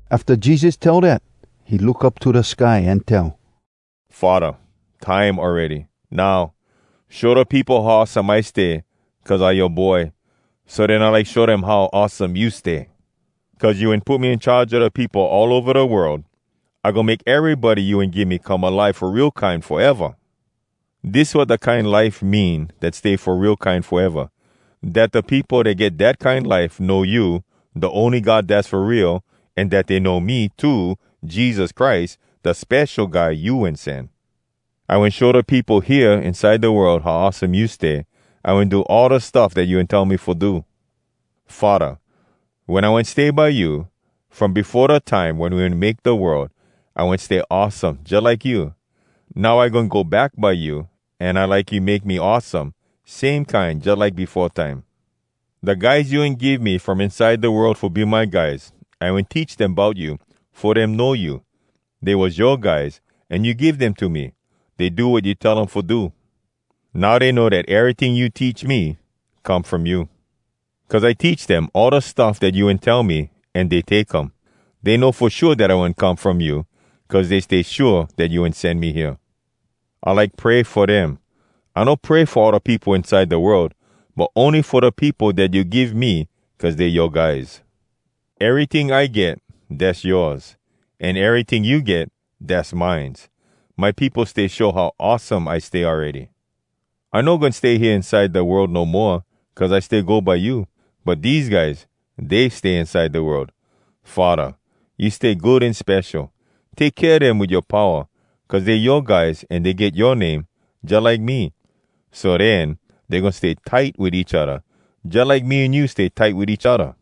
Afta Jesus tell dat, he look up to da sky an tell, “Faddah, time awready. Now, show da peopo how awesome I stay cuz I yoa Boy, so den I like show dem how awesome you stay. Cuz you wen put me in charge a da peopo all ova da world, I goin make erybody you wen give me come alive fo real kine foeva. Dis wat da kine life mean dat stay fo real kine foeva: dat da peopo dat get dat kine life know you, da ony God dass fo real, an dat dey know me too, Jesus Christ, da Spesho Guy You Wen Sen. I wen show da peopo hea inside da world how awesome you stay. I wen do all da stuff dat you wen tell me fo do. Faddah, wen I wen stay by you, from befo da time wen we wen make da world, I wen stay awesome jalike you. Now I goin go back by you, an I like you make me awesome, same kine jalike befo time. “Da guys you wen give me from inside da world fo be my guys, I wen teach dem bout you, fo dem know you. Dey was yoa guys, an you give dem to me. Dey do wat you tell um fo do. Now dey know dat eryting you teach me, come from you. Cuz I teach dem all da stuff dat you wen tell me, an dey take um. Dey know fo shua dat I wen come from you, cuz dey stay shua dat you wen sen me hea. “I like pray fo dem. I no pray fo all da peopo inside da world, but ony fo da peopo dat you give me, cuz dey yoa guys. Eryting I get, dass yoas. An eryting you get, dass mines. My peopo stay show how awesome I stay awready. I no goin stay hea inside da world no moa, cuz I stay go by you. But dese guys, dey stay inside da world. Faddah, you stay good an spesho. Take kea dem wit yoa powa, cuz dey yoa guys, an dey get yoa name, jalike me. So den, dey goin stay tight wit each odda, jalike me an you stay tight wit each odda.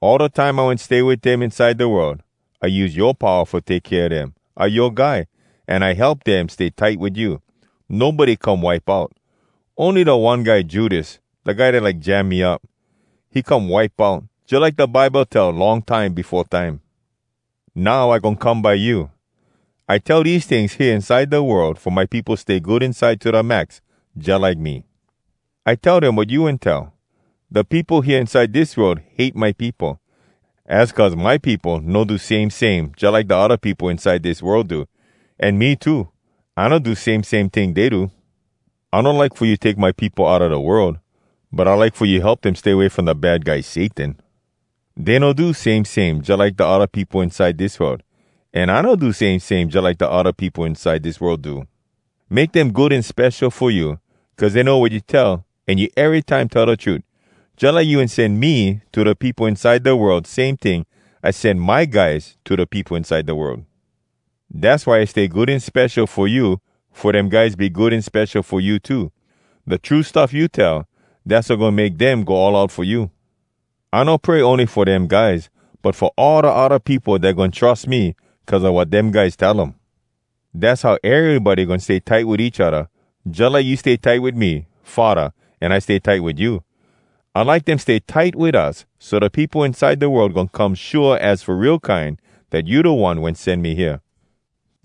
All da time I wen stay wit dem inside da world, I use yoa powa fo take kea dem. I yoa guy, an I help dem stay tight wit you. Nobody come wipe out. Ony da one guy Judas, da guy dat like jam me up, he come wipe out, jalike da Bible tell long time befo time. “Now I goin come by you. I tell dese tings hea inside da world fo my peopo stay good inside to da max, jalike me. I tell dem wat you wen tell. Da peopo hea inside dis world hate my peopo. Az cuz my peopo no do same same jalike da odda peopo inside dis world do. An me too, I no do same same ting dey do. I no like fo you take my peopo outa da world, but I like fo you help dem stay away from da Bad Guy Satan. Dey no do same same jalike da odda peopo inside dis world. An I no do same same jalike da odda peopo inside dis world do. “Make dem good an spesho fo you, cuz dey know wat you tell, an you erytime tell da trut. Jalike you wen sen me to da peopo inside da world, same ting, I sen my guys to da peopo inside da world. Dass why I stay good an spesho fo you, fo dem guys be good an spesho fo you too. Da true stuff you tell, dass wat goin make dem go all out fo you. “I no pray ony fo dem guys, but fo all da odda peopo dat goin trus me cuz a wat dem guys tell um. Dass how erybody goin stay tight wit each odda, jalike you stay tight wit me, Faddah, an I stay tight wit you. I like dem stay tight wit us, so da peopo inside da world goin come shua az fo real kine, dat you da One wen sen me hea.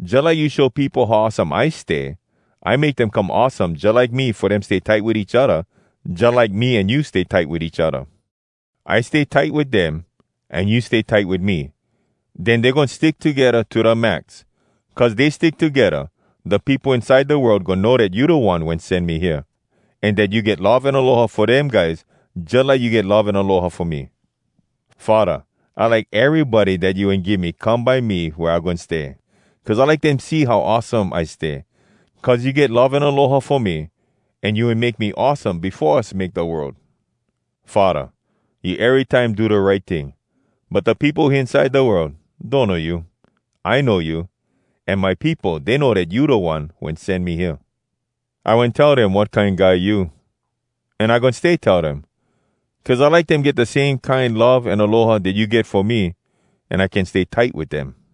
Jalike you show peopo how awesome I stay, I make dem come awesome jalike me fo dem stay tight wit each odda, jalike me an you stay tight wit each odda. I stay tight wit dem, an you stay tight wit me. Den dey goin stick togedda to da max. Cuz dey stick togedda, da peopo inside da world goin know dat you da One dat sen me hea, an dat you get love an aloha fo dem guys jalike you get love an aloha fo me. “Faddah, I like erybody dat you wen give me come by me wea I goin stay, cuz I like dem see how awesome I stay. Cuz you get love an aloha fo me, an you wen make me awesome befo us make da world. Faddah, you erytime do da right ting. But da peopo hea inside da world donno you. I know you, an my peopo, dey know dat you da One wen sen me hea. I wen tell dem wat kine guy you, an I goin stay tell dem, cuz I like dem get da same kine love an aloha dat you get fo me, an I can stay tight wit dem.”